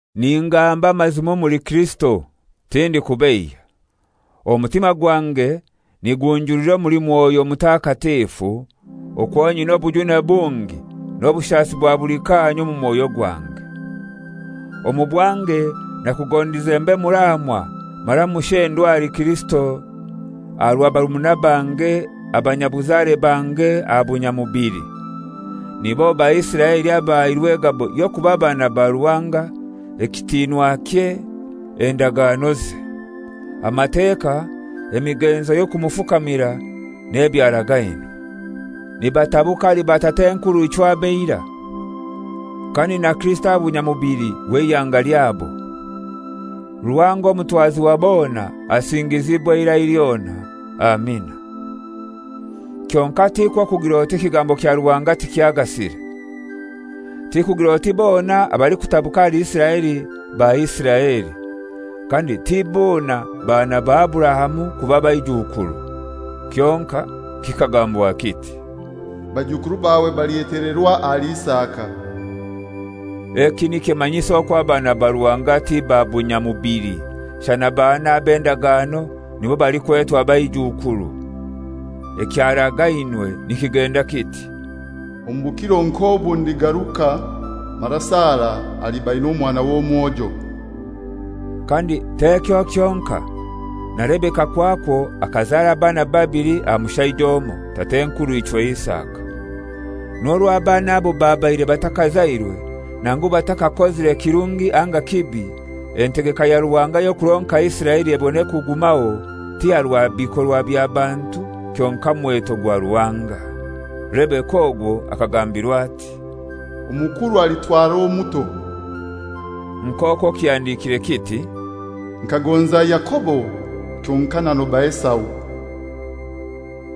Ningamba amazima omuli Kirisito, tindikubeiya. Omutima gwange nigunjulira omuli Mwoyo Mutakatifu, okwo nyina obujune bungi n'obushasi bwa buli kaanya omu mwoyo gwange. Omu bwange nakugondize mbe muraamwa mara mushendwa ahali Kirisito aha rwa barumuna bange abanyabuzare bange aha bunyamubili. Nibo Baisiraeli abahairwe egabo y'okuba baana ba Ruhanga, ekitinwakye, endaganoze. Amateka, emigenzo y'okumufukamira, n'ebyaragainwe. Nibatabuka ahali batat'enkurw'ichwe ab'eirai, kandi na Kirisito aha bunyamubili, w'eihanga lyabo. Ruhanga omutwazi wa bona asingizibwe eirai lyona. Amina. Kyonkai tikwo kugir'oti ekigambo kya Ruhanga tikyagasire. Tikugir'oti bona abalikutabuka ahali Isiraeli ba Isiraeli, kandi ti bona baana ba Aburahamu kuba baijukuru, kyonkai kikagambwa kiti, «Baijukuru bawe balyetelerwa ahali Isaka.» Eki nikimanyisa okwo abaana aba Ruhanga ti ba bunyamubili, shana abaana ab'endagano nibo balikwetwa baijukuru. Ekyaragainwe nikigenda kiti, «Omu bukiro nk'obu ndigaruka mara Sara aliba aina omwana w'omwojo.» Kandi t'ekyo kyonkai, na Rebeka kwakwo akazara abaana babili aha mushaija omoi, tat'enkurw'ichwe Isaka. N'orwo abaana abo babaire batakazairwe nangu batakakozire kirungi anga kibi, entegeka ya Ruhanga y'okuronka Isiraeli ebone kugumaho, ti aha rwa bikorwa bya bantu kyonkai mweto gwa Ruhanga, Rebeka ogwo akagambirwa ati, «Omukuru alitwarwa omuto.» Nk'okwo kihandikire kiti, «Nkagonza Yakobo kyonkai nanoba Esau.»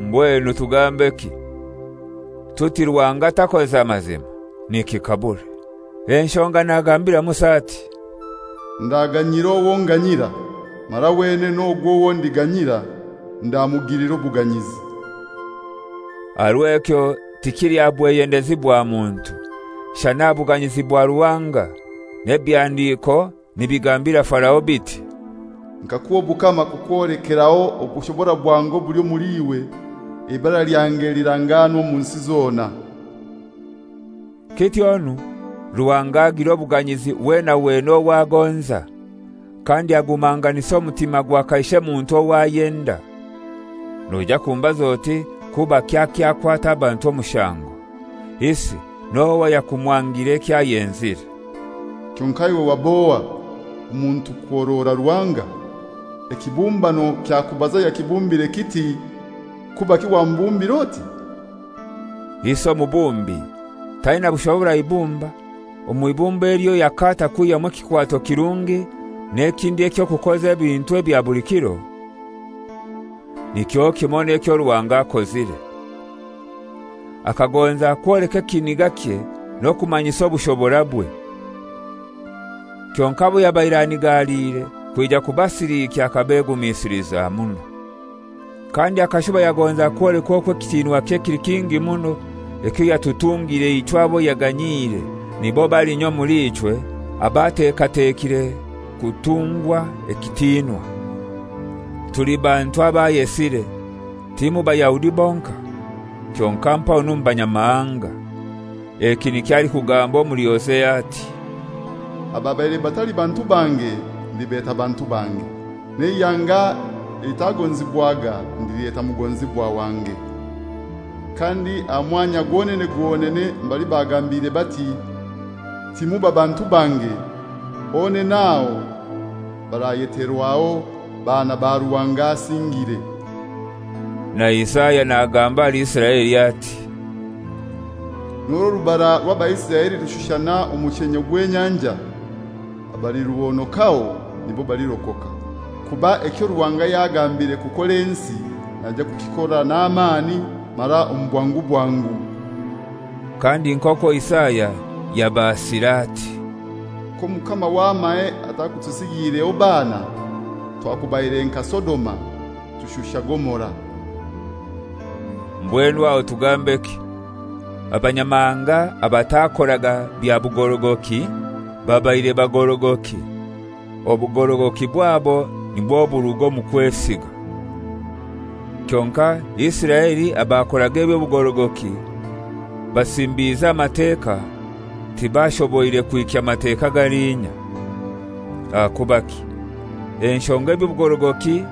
Mbwenu tugambeki? Tuti Ruhanga takoza mazima? Nikikabure! Enshonga nagambira Musa ati, «Ndaganyira owo nganyira; mara wenene ogwo owo ndiganyira ndamugilira obuganyizi.» Aha rw'ekyo tikili aha bweyendezi bwa muntu, shana aha buganyizi bwa Ruhanga, n'ebihandiko nibigambira Farao biti, «Nkakuha obukama kukwolekeraho obushobora bwange obuli omuli iwe, eibara lyange lirangaanwe omu nsi zona.» Kityonu Ruhanga agilira obuganyizi wena wena ow'agonza, kandi agumanganisa omutima gwa kaishe muntu owo ayenda. Noija kumbaza oti, «Kubaki akyakwata abantu omushango? Isi n'ohai ayakumwangira eky'ayenzire?» Kyonkai iwe wab'ohai, omuntu kuhorora Ruhanga? Ekibumbano kyakubaza ayakibumbire kiti, «Kubaki wambumbire oti?» Isi omubumbi taina bushobora aha ibumba, omw'ibumba elyo yakaata kwihyamu ekikwato kirungi n'ekindi eky'okukoza ebintu ebya buli kiro? Nikyo kimoi n'ekyo Ruhanga akozire. Akagonza kwoleka ekinigakye n'okumanyisa obushoborabwe. Kyonkai abo yabaire anigaliire kwija kubasilikya akabegumisiliza muno. Kandi akashuba yagonza kwoleka okwo ekitinwakye kili kingi muno ekyo yatutungire ichwe abo yaganyiire, nibo balinya omuli ichwe ab'atekatekire kutungwa ekitinwa. Tuli bantu abo ayesire, ti mu Bayahudi bonkai, kyonkai mpaho n'omu Banyamahanga. Eki nikyo alikugamba omuli Hosea ati, «Ababaire batali bantu bange ndibeta ‹Bantu bange,› n'eihanga elitagonzibwaga ndilyeta ‹Mugonzibwa wange.› Kandi aha mwanya gwonene gwonene mbali bagambiirwe bati, ‹Timuba bantu bange,› honene aho barayeterwaho, ‹Baana ba Ruhanga Asingire.›» Na Isaya nagamba ahali Isiraeli ati: «N'orwo orubara rw'Abaisiraeli rulishusha omushenye gw'enyanja, abaliruhonokaho nibo balirokoka; kuba ekyo Ruhanga yagambire kukora ensi naija kukikora n'amani mara omu bwangu bwangu.» Kandi nk'okwo Isaya yabaasire ati, «K'Omukama w'amahe atakutusigiireho baana, twakubaire nka Sodoma, tushusha Gomora.» Mbwenu aho tugambeki? Abanyamahanga abatakoraga bya bugorogoki babaire bagorogoki, obugorogoki bwabo nibwo buruga omu kwesiga. Kyonkai Isiraeli abakoraga eby'obugorogoki basimbize aha Mateka tibashoboire kuhikya Mateka galinya. Ahakubaki? Enshonga eby'obugorogoki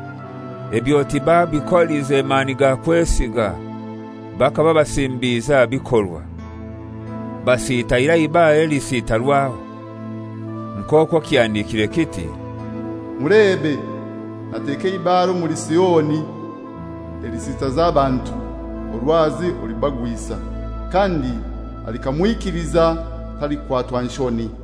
ebyo tibabikolize mani ga kwesiga, bakaba basimbize aha bikorwa. Basitaire aha «Ibare elisitarwaho,» nk'okwo kihandikire kiti, «Mulebe, nateka eibare omuli Sioni elilisitaza abantu, orwazi orulibagwisa; kandi alikamwikiliza talikwatwa nshoni.»